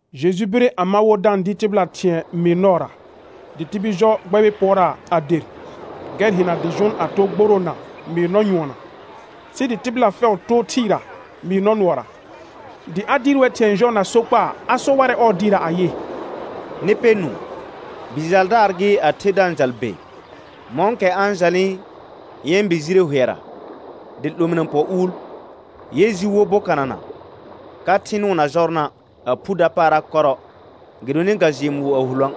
Jeju bire a ma wo da-n dɩɩr tɩbɩla thɩ̃ɛ mɩɩr nɔɔra, dɩ tibil jɔ gbɛbɩ pʋɔraa a der, gɛr hɩna dɩ jʋʋn a too gboroona mɩɩr nɔ nyʋɔnɔ, sɩ dɩ tɩbɩla fɛʋ too thɩɩra mɩɩr nɔ nʋɔra. Dɩ a dɩɩr wɛr thɩ̃ɛ jɔɔ na sokpaa, a so warɛ ɔɔ dɩɩrra ayɩ: Nɩ pɛ nũu: Bi jaldaar gɩ, a the da-n jal be. Mɔ̃kɛ a-n jalnɩ yɛ̃ bi jire hʋɛra, dɩ 'lominə pɔ uul. Yɛ ji wo bokanana ka thɩ nʋʋn na jɔrna', a phu dapaara kɔrɔ gɩdonɩ ga jɩɩ mʋʋ a hulõə';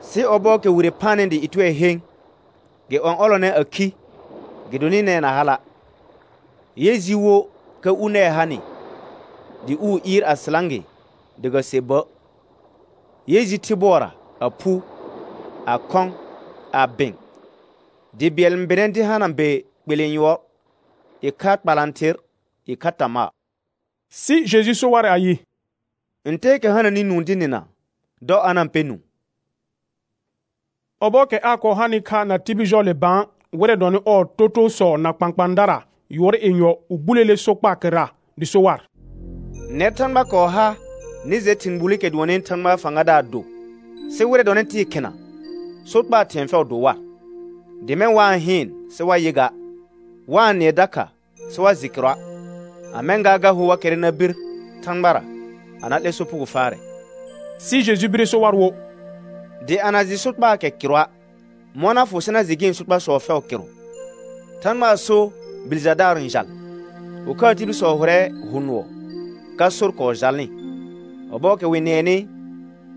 sɩ ɔbɔɔkɛ wire phanɩ dɩ ɩtʋɛ hẽ, gɩ ɔ̃'ɔlɔnɛ a khi, gɩdonɩ nɛɛ na hala'. Yɛ ji wo ka u nɛɛ hanɩ, dɩ uu ɩɩr a sɩlã gɩ dɩ ga se bə'. Yɛ ji thɩ bʋɔra, a phu, a khɔ̃, a bɩ̃, bi bɩɛl n bɩnɛ dɩ hana be kpelẽ yʋɔr, ɩkha kpalãther, ɩkha tamaa. Sɩ Jeju so warɛ ayɩ: Ntɛɛkɛ hananɩ nũu dɩ nɩna, dɔ a na-n pɛ nũu. Ɔbɔɔkɛ aa kɔɔ hanɩ kha na tibil jɔɔle bã, wɩrɛ dɔnɩ ɔɔ totoosɔ na kpãkpãadara yʋɔr yenyɔ wɩ buleele sokpaa kɩrra. Dɩ so war: Nɛr Thãgba kɔɔ ha nɩ jɛ thɩ̃ gbulikɛ dʋɔnnɩ Thãgbaa fãgadaar do, sɩ wɩrɛ dɔnɩ tɩɩ khina, sokpaa thɩ̃ɛ fɛʋ do war, dɩ mɛ̃, «Wa-n hɩɩn sɩ wa yɩ ga, wa-n nɩɛ dakha sɩ wa jɩ kɩrʋa', a mɛ̃ gaa, ga hor wa kɛrrɛ na bir Thãgbara a na 'lɛ sopugo faarɛ.» Sɩ Jeju bire so war wo: Dɩ a na jɩ sokpaakɛ kɩrʋa', mɔ̃ na fʋ sɩ na jɩ gɩ̃ sokpasɔ fɛʋ kɩrʋ? Thãgbaa so bi jaldaar n jal. Ɩkhaa tibilsɔ hʋrɛ hʋ nʋɔ ka sor kɔɔ jalnɩ. Ɔbɔɔkɛ wɩ-n nɩɛnɩ,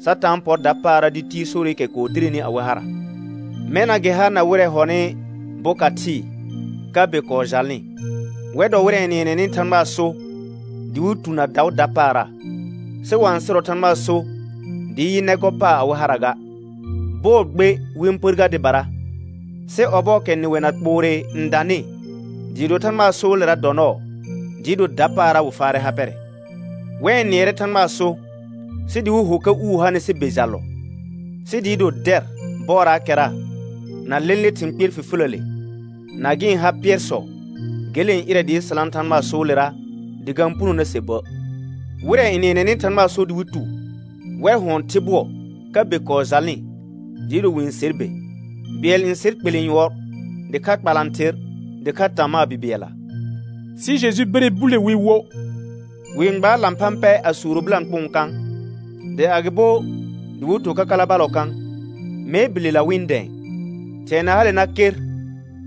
Satã n pɔr dapaara dɩ tiir sorɩkɛ kɔɔ direni awɩ hara. Mɛna gɩ ha na wɩrɛ hɔnɩ boka thɩɩ ka be kɔɔ jalnɩ. Wɛr dɔ wɩrɛ n nɩɛnɛnɩ Thãgbaa so dɩ wɩ tu na daʋ dapaara, sɩ wa-n sɩrɔ Thãgbaa so dɩɩ yɩ nɛ gɔ paar awɩ hara ga. Bɔɔ gbe wɩ-n pər gar dɩbara, sɩ ɔbɔɔkɛ nɩwɛ na kpoore n danɩ, dɩɩ do Thãgbaa soolera dɔ nɔɔ, dɩɩ do dapaara wɩ faarɛ ha pɛrɛ. Wɛ n nɩɛrɛ Thãgbaa so, sɩ dɩ wɩ ho ka uu hanɩ sɩ be jallɔ; sɩ dɩɩ do dɛr bɔɔraakɛra na lẽle thɩ̃ kpɩɛr fifiləle na gɩ̃ ha pɩɛrsɔ, gele n ɩrɛ dɩɩ sɩlã Thãgbaa soolera dɩ ga-n puno na se bə'. Wɩrɛ n nɩɛnɛnɩ Thãgbaa so dɩ wɩ tu, wɛr hʋɔn thɩ bʋɔ, ka be kɔɔ jalnɩ dɩɩ do wɩ-n ser be: Bɩɛl n ser kpelẽ yʋɔr, dɩkha kpalãther, dɩkha tamaa bi bɩɛlla. Sɩ Jeju bire bule wi wo: Wɩ-n gbaar lãphã pɛ a suuro bɩlãkpʋʋn kã? Dɩ agɩbo dɩ wɩ to kakala ballɔ kã? Mee bilela wɩ-n dɛ̃ɛ. Thɩ̃ɛ na hale na ker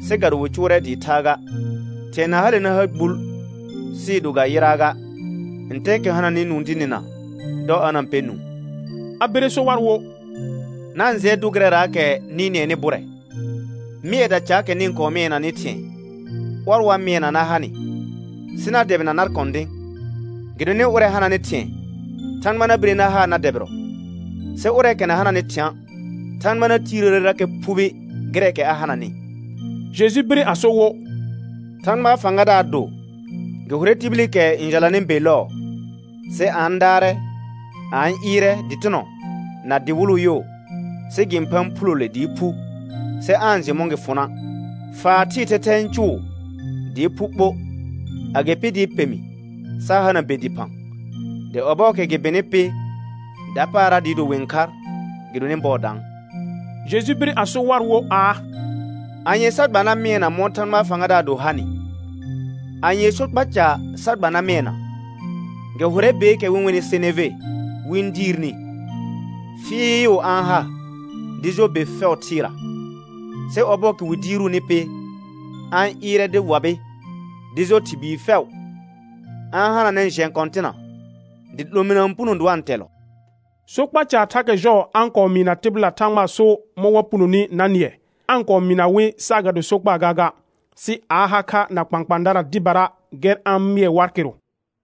sɩ ga do wɩ cʋʋrɛ dɩɩ thaa ga; thɩ̃ɛ na hale na ha gbul sɩɩ do ga yɩraa ga. Ntɛɛkɛ hananɩ nũu dɩ nɩna, dɔ a na-n pɛ nũu. A bire so war wo: Na-n jɩɛ dʋ gɩrɛraakɛ nɩ nɩɛnɩ bʋrɛ; mɩɛda caakɛ nɩ kɔɔ mɩɛnanɩ thɩ̃ɛ, ɔr wa mɩɛna na ha nɩ sɩ na dɛbɩna nar kɔ̃dɩ̃. Gɩdonɩ ʋrɛ hananɩ thɩ̃ɛ, Thãgba na bire na haa na dɛbɩrɔ; sɩ ʋrɛɛkɛ na hananɩ thɩ̃a', Thãgba na tiirəərerakɛ phubi gɩrɛɛkɛ a hananɩ. Jeju bire a so wo: Thãgbaa fãgadaar do, gɩ hʋrɛ tibilikɛ n jalanɩ be lɔɔ; sɩ a a-n daarɛ, a a-n ɩɩrɛ, dɩtɩnɔ na dɩwɩlʋ yo, sɩ gɩ-n phaan phulole dɩɩ phu, sɩ aa-n jɩ mɔ̃ gɩ fʋna'; faa thɩɩ thɛthɛ n cʋʋ dɩɩ phu ɓo, agɩpɩ dɩɩ pemi sa hana be dɩphã. Dɩ ɔbɔɔkɛ gɩ bɩnɩ pɩ, dapaara dɩɩ do wɩ-n khar gɩdonɩ bɔɔ daan. Jeju bire a so war wo aa: Anye sa gba na mɩɛna mɔ̃ Thãgbaa fãgadaar do hanɩ, anyee sokpa ca sa gba na mɩɛna? Gɩ hʋrɛ beekɛ wɩ-n wenɩ seneve wɩ-n diirni, fɩɩʋ a-n ha dɩ jɔ be fɛʋ thɩɩra. Sɩ ɔbɔɔkɛ wɩ diiruuni pɩ, a-n ɩɩrɛ dɩ wabɩ dɩ jɔ thɩr bii fɛʋ; a-n hananɛ jɛ̃ kɔ̃tɩna dɩ 'lominə n puno dɩ wa-n tɛllɔ. Sokpa caar thakɛ jɔɔ a-n kɔɔ mɩɩna tɩbɩla Thãgbaa so mɔ̃ wa punoni na nɩɛ; aa-n kɔɔ mɩɩna wɩ saagado sokpa gaaga, sɩ a a ha kha na kpãkpãadara dɩbara gɛr a-n mɩɛ war kɩrʋ.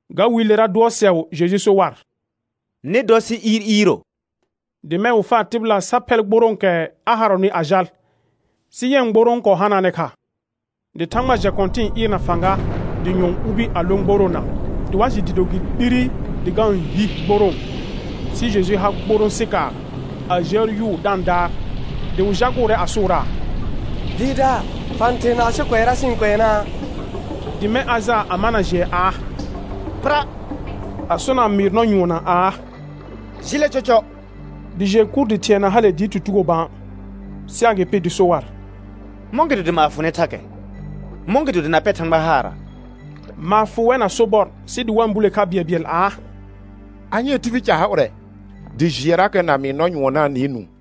Ga wiilera dʋɔsɛʋ Jeju so war: Nɩ dɔ sɩ iir iiro. Dɩ mɛ̃ wɩ faa tɩbɩla sa phɛl gborõokɛ a harɔnɩ a jal, sɩ yɛ̃ gborõ kɔɔ hanaanɛ kha. Dɩ thãgba jɛ kɔ̃tɩ̃ɩ ɩɩr na fãga, dɩ nyʋɔn ubi a lõ gboroona, dɩ wa jɩ dɩɩ do gɩ 'lire dɩ ga-n hi gborõo. Sɩ Jeju ha gborõ sɩkaar, a jəə yʋʋ da-n daar; dɩ wɩ jagʋʋrɛ a sʋʋraa: Dɩɩrdaar fa-n therna asɩ kʋɛra sɩ-n kʋɛnaa? Dɩ mɛ̃ a jaa a mana jɩɛ aa: Pɩra; a sona mɩɩr nɔ nyʋɔnna aa: Jɩlɛ cɔcɔ; dɩ jɩɛ kur dɩ thɩ̃ɛ na hale dɩɩ tutugo bã. Sɩ agɩpɩ dɩ so war: Mɔ̃gɩdo dɩ maar fʋ nɩ thakɛ? Mɔ̃gɩdo dɩ na pɛr Thãgba haara? Maar fʋ wɛr na sobɔr sɩ dɩ wa-n bule kha bɩɛlbɩɛl aa: Anyee tibil ca ha ʋrɛ, dɩ jɩɛrakɛ na mɩɩr nɔ nyʋɔn na-n nɩɩ nũu?